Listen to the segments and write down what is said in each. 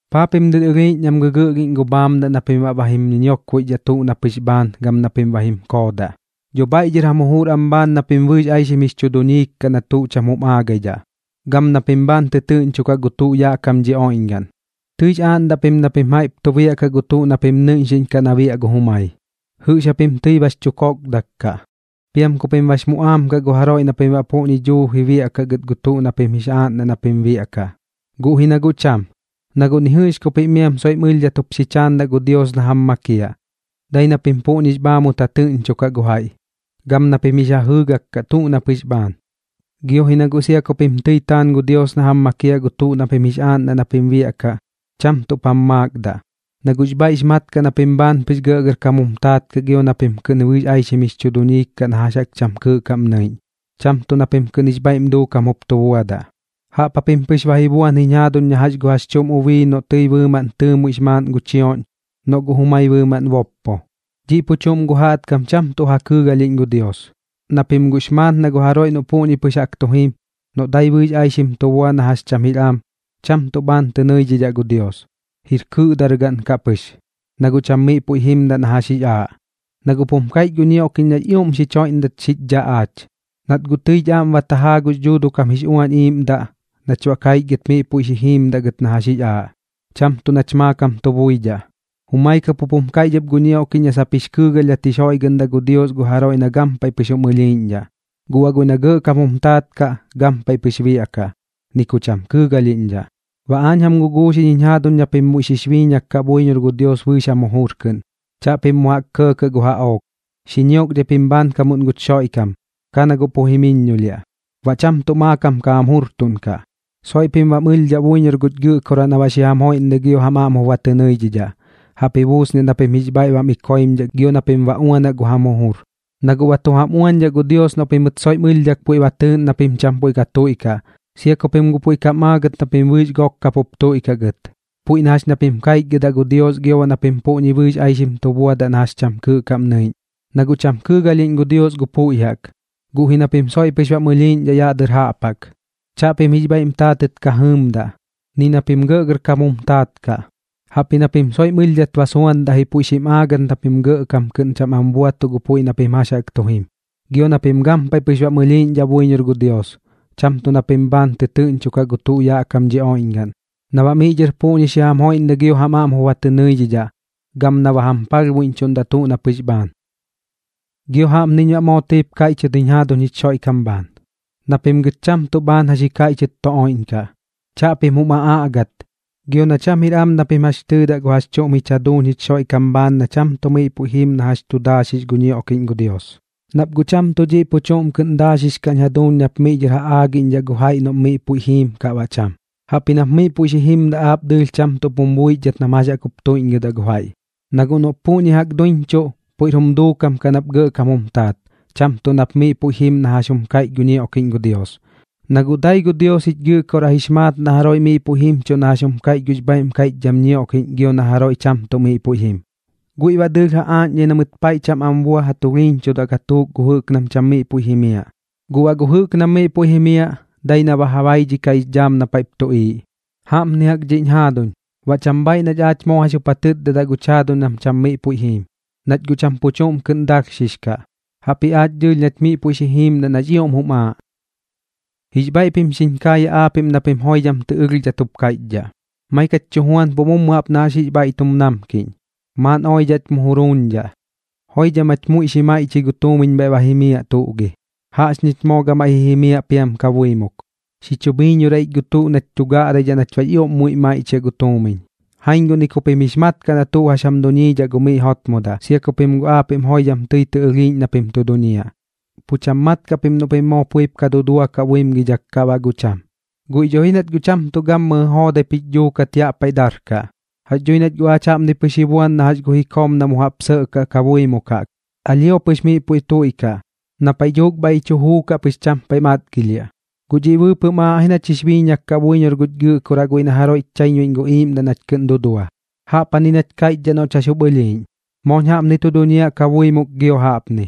¿Paa pim dɨr ɨlhiiꞌñ nam gɨgɨꞌlhiꞌñ gu bhaamdaꞌ na pim baꞌ ba jim ñiñiokboixdhaꞌ tuꞌ na pɨx bhaan gam na pim ba jim koodaꞌ? Dho bhaiꞌ dhɨr jam jujur am bhaan na pim bɨɨx aixim jix chu duñiik kaꞌ na tuꞌ cham jum aagaidhaꞌ, gam na pim bhaan tɨtɨɨꞌñchokaꞌ gu tuꞌ yaꞌ kam dhi oiꞌñgaꞌn. Tɨix aaꞌndaꞌ pim na pim jaiꞌp biaꞌkaꞌ gu tuꞌ na pim nɨiꞌñxiꞌñkaꞌ na biaꞌ gu jumai. Jɨꞌx japim tɨi bax chu kokdak kaꞌ, piam ku pim bax muꞌaam kaꞌ gu jaroiꞌ na pim baꞌ puꞌñi duuji ba biaꞌkaꞌ gɨt gu tuꞌ na pim jix aaꞌndaꞌ na pim biaꞌkaꞌ. Guꞌ ji na guꞌ cham, na guꞌ ni jɨꞌx ku pim soiꞌm ɨlhdhat jup xi chaandaꞌ gu Dios na jam makiaꞌ, dai na pim puꞌñix bhaamut ja tɨꞌñchokaꞌ gu jaiꞌ, gam na pim jix ja jɨɨgak kaꞌ tuꞌ na pɨx bhaan. Gio ji na guꞌ sia ku pim tɨi taan gu Dios na jam makiaꞌ gu tuꞌ na pim jix aaꞌndaꞌ na pim biaꞌkaꞌ, cham tuꞌp jam maakdaꞌ, na guꞌx bhaiꞌx maat kaꞌ na pim bhaan pɨx gɇꞌgɇrkam jum taat kaꞌ gio na pim kɨꞌn bɨɨx aixim jix chu duñiik kaꞌ na jax jaꞌk cham kɨɨꞌ kaꞌm nɨiꞌñ, cham tuꞌ na pim kɨꞌn jix bhaiꞌm duukam jup tu buadaꞌ. Jaꞌp japim pɨx ba ji buan jiñ jaaduñ na jax gu jax chuꞌm ubii noꞌ tɨi bɨɨmaꞌn tɨɨmuiꞌx maaꞌn gu chioꞌñ, noꞌ guꞌ jumai bɨɨmaꞌn boppo. Dhiꞌ pu chuꞌm gu jaꞌtkam cham tuꞌ ja kɨɨgalhiꞌñ gu Dios, na pim guꞌx maat na gu jaroiꞌ noꞌ puꞌñi pɨx jaꞌk tu jim, noꞌ dai bɨɨx aixim tu bua na jax cham jir am, cham tuꞌ bhaan tɨ nɨidhidhaꞌ gu Dios, jir kɨꞌdargaꞌn kaꞌ pɨx, na guꞌ cham miꞌ puiꞌ jimdaꞌ na jax jix aaꞌ. Na guꞌp jum kaiꞌch gu ñioꞌkiꞌñ nax ioꞌm xich joiꞌndat xich dhaꞌ aach, nat guꞌ tɨich aꞌm ba tajaa gux Dhuuduꞌ kam jix Uañ Iiꞌmdaꞌ nach baꞌ kaichgɨt miꞌ puiꞌ xi jiimdaꞌ gɨt na jax jix aaꞌ, cham tuꞌ nach maakam tu buidhaꞌ. Jumai kap jup jum kaiꞌch ɨp gu ñioꞌkiꞌñ na sap jix kɨɨgalhdhat jix joiꞌgɨꞌndaꞌ gu Dios gu jaroiꞌ na gampaiꞌ pɨx jum ɨlhiiꞌñdhaꞌ, guꞌ baꞌ guiꞌ na gɇꞌkam jum taat kaꞌ, gampaiꞌ pɨx biaꞌkaꞌ, ni ku cham kɨɨgalhiꞌñdhaꞌ. Baꞌ aañ jam guguuxiꞌñ jiñ jaaduñ na pim muiꞌ xix biiñak kaꞌ buiñor gu Dios bɨɨx jam jujur kɨꞌn. Chaꞌpim mu jaꞌk kɇɇkɇꞌ gu jaꞌook. Xi ñiokdhai pim bhaankamuꞌn guch Xoiꞌkam, ka na guꞌ pu jimiññolhiaꞌ, baꞌ cham tuꞌ maakam ka jam jurtuꞌnkaꞌ. Soiꞌ pim bam ɨlhdhaꞌ buiñor guch Gɨꞌkoraꞌ na baꞌ xi jam joiꞌndai gio jam aꞌm jup ba tɨ nɨidhidhaꞌ. Jaꞌp ji buusniaꞌ na pim jix bhaiꞌ bam iꞌkoimdhaꞌ gio na pim ba uanaꞌ gu jam jujur, na guꞌ ba tu jam uañdhaꞌ gu Dios noꞌ pimɨt soiꞌm ɨlhdhak puiꞌ ba tɨɨꞌn na pim cham puiꞌ ka tuiꞌkaꞌ, sia ku pim guꞌ puiꞌ tɨi kam aagɨt na pim bɨɨx gok kap jup tuiꞌkaꞌ gɨt, puiꞌ na jax na pim kaichgɨdaꞌ gu Dios gio baꞌ na pim puꞌñi bɨɨx aixim tu buadaꞌ gɨt na jax cham kɨɨꞌ kaꞌm nɨiꞌñ. Na guꞌ cham kɨɨgalhiꞌñ gu Dios gu puiꞌ jaꞌk, guꞌ ji na pim soiꞌ pɨx bam ɨlhiiꞌñdhaꞌ yaꞌ dɨr jaꞌp jaꞌk. Chaꞌpim jix bhaiꞌm taatɨt ka jɨɨmdaꞌ, ni na pim gɇꞌgɇrkam jum taat kaꞌ, jaꞌpji na pim soiꞌm ɨlhdhat ba suandaꞌ ji puiꞌ xim aagɨt na pim gɇꞌkam kɨꞌn cham am buatuꞌ gu puiꞌ na pim jax jaꞌk tu jim. Gio na pim gampaiꞌ pɨx bam ɨlhiiꞌñdhaꞌ buiñor gu Dios, cham tuꞌ na pim bhaan ka tɨtɨɨꞌñchokaꞌ gu tuꞌ yaꞌ kam dhi oiꞌñgaꞌn, na baꞌ miꞌ dhɨr puꞌñi xi jam joiꞌndai gio jam aꞌm jup ba tɨ nɨidhidhaꞌ, gam na ba jam palhbuiꞌñchuꞌndaꞌ tuꞌ na pɨx bhaan. Gio jaꞌpniñ baꞌ moo tɨip kaiꞌchɨt jiñ jaaduñ jich Xoiꞌkam bhaan, na pim gɨt cham tuꞌ bhaan jax ji kaiꞌchɨt tu oiꞌñkaꞌ. Chaꞌpim jum aꞌaꞌgat, gio na cham jir am na pim jax tɨɨdaꞌ gu jax chuꞌm jich jaduuñ jich Xoiꞌkam bhaan na cham tuꞌ miꞌ puiꞌ jim na jax tu daaxix gu ñioꞌkiꞌñ gu Dios. Nap guꞌ cham tuꞌ dhiꞌ pu chuꞌm kɨꞌn daaxix kaꞌñ jaduuñ nap miꞌ dhɨr ja aagiꞌñdhaꞌ gu jaiꞌ noꞌm miꞌ puiꞌ jiim kaꞌ baꞌ cham, jaꞌpji nap miꞌ puiꞌ xi jimdaꞌ aap dɨɨlh cham tuꞌp jum buixdhat nam jax jaꞌk jup tuiꞌñgɨdaꞌ gu jaiꞌ. Na guꞌ noꞌp puꞌñi jaꞌk duiñchuꞌ, puiꞌr jum duukam kaꞌ nap gɇꞌkam jum taat, cham tuꞌ nap miꞌ puiꞌ jim na jax jum kaiꞌch gu ñioꞌkiꞌñ gu Dios. Na guꞌ dai gu Dios jich Gɨꞌkoraꞌ jix maat na jaroiꞌ miꞌ puiꞌ jimchuꞌ na jax jum kaiꞌch gux bhaiꞌm kaiꞌchdham ñioꞌkiꞌñ gio na jaroiꞌ cham tuꞌ miꞌ puiꞌ jim. Guiꞌ baꞌ dɨɨlh ja aaꞌñdhai na mɨt paiꞌ cham am bua ja tulhiiñchudaꞌ gatuuk gu jɨꞌk nam cham miꞌ puiꞌ jimiaꞌ. Guꞌ baꞌ gu jɨꞌk nam miꞌ puiꞌ jimiaꞌ, dai na ba ja baidhikaꞌx dhaam na paiꞌp tuꞌiiꞌ. Jaꞌpni jaꞌk dhiꞌñ jaaduñ, baꞌ cham bhaaiꞌ nach aach moo jax jup ja tɨtdadaꞌ guch jaaduñ nam cham miꞌ puiꞌ jiim, nach guꞌ cham pu chuꞌm kɨꞌn dalhxix kaꞌ. Jaꞌpji aach dɨɨlh nach miꞌ puiꞌ xi jiimdaꞌ nax ioꞌm jum aaꞌ. Jix bhaiꞌ pim xiñ kaayaꞌ aapiꞌm na pim joidham tɨ ɨlhdhat jup kaiꞌchdhaꞌ: “Maik jach tu juanpuꞌ mummu jaꞌp na jax jix bhaiꞌ tum namkiꞌñ. Maaꞌn oidhaꞌch mu juruuñdhaꞌ, joidham jach muiꞌ xi maiꞌchɨi gu tuumiñ bhaiꞌp ba jimiaꞌ, tuꞌ gi. Jaꞌxñich moo gamaiꞌ ji jimiaꞌ piam kabuimuk, xi chu bhiiñorai ich gu tuꞌ nach tu gaꞌraidhaꞌ nach baꞌx ioꞌm muiꞌ maiꞌchiaꞌ gu tuumiñ.” Jaiñ guꞌ ni ku pim jix mat kaꞌ na tuꞌ jax jam duñiidhaꞌ gu miꞌ jotmodaꞌ, sia ku pim aapiꞌm joidham tɨi tɨ ɨlhiiꞌñ na pim tu duñiaꞌ. Pu cham mat kaꞌ pim noꞌ pim moo puiꞌp ka duduakaꞌ buimgidhak kaꞌ baꞌ guꞌ cham, guiꞌ dho ji nach guꞌ cham tuꞌ gammɨjɨ joodaip jich dhuukat yaꞌ paiꞌ darkaꞌ. Jax dhui nach guꞌ aach jaꞌpni pɨx ji buan na jax gu jikoom na mu jaꞌp sɇꞌkaꞌ kabuimuk jaꞌk. Alhio pɨx miꞌ puiꞌ tuiꞌkaꞌ, na paiꞌ dhuuk bhaiꞌ ji chu juukaꞌ pɨx cham paiꞌ matgilhiaꞌ. Guꞌ dhiꞌ bɨɨpɨꞌm aaꞌ ji nach jix biiñak kaꞌ buiñor guch Gɨꞌkoraꞌ guiꞌ na jaroiꞌch chaiñbuiꞌñ gu iiꞌmdaꞌ nach kɨꞌn dudua. Jaꞌpjani nach kaiꞌchdhaꞌ noꞌch jax jup ɨlhiiꞌñ: “Mooñ jaꞌpni tu duñiaꞌ kabuimuk gio jaꞌpni,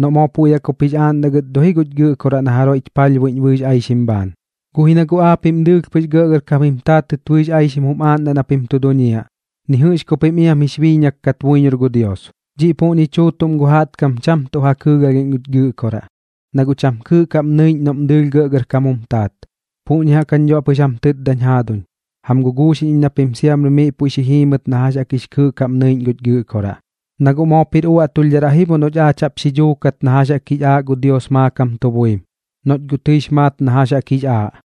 noꞌ moo puiꞌ jaꞌk jup jix aaꞌndaꞌ gɨt dho ji guch Gɨꞌkoraꞌ na jaroiꞌch palhbuiꞌñ bɨɨx aixim bhaan.” Guꞌ ji na guꞌ aapiꞌm dɨɨlh pɨx gɇꞌgɇrkam jim taatɨt bɨɨx aixim jum aaꞌndaꞌ na pim tu duñiaꞌ, ni jɨꞌx ku pim iam jix biiñak kat buiñor gu Dios. Dhiꞌ puꞌñi chuutuꞌm gu jaꞌtkam, cham tuꞌ ja kɨɨgalhiꞌñ guch Gɨꞌkoraꞌ, na guꞌ cham kɨɨꞌ kaꞌm nɨiꞌñ noꞌm dɨɨlh gɇꞌgɇrkam jum taat. Puꞌñi jaꞌk jañ dho baꞌ pɨx jam tɨtdañ jaaduñ, jam guguuxiꞌñ iñ na pim siamri miꞌ puiꞌ xi jiimɨt na jax jaꞌk jix kɨɨꞌ kaꞌm nɨiꞌñ guch Gɨꞌkoraꞌ. Na guꞌ moop jir uaꞌtulhdharaꞌ ji bo noꞌch aach jaꞌp xi dhuukat na jax jaꞌk jix aaꞌ gu Dios maakam tu buim, noꞌch guꞌ tɨix maat na jax jaꞌk jix aaꞌ.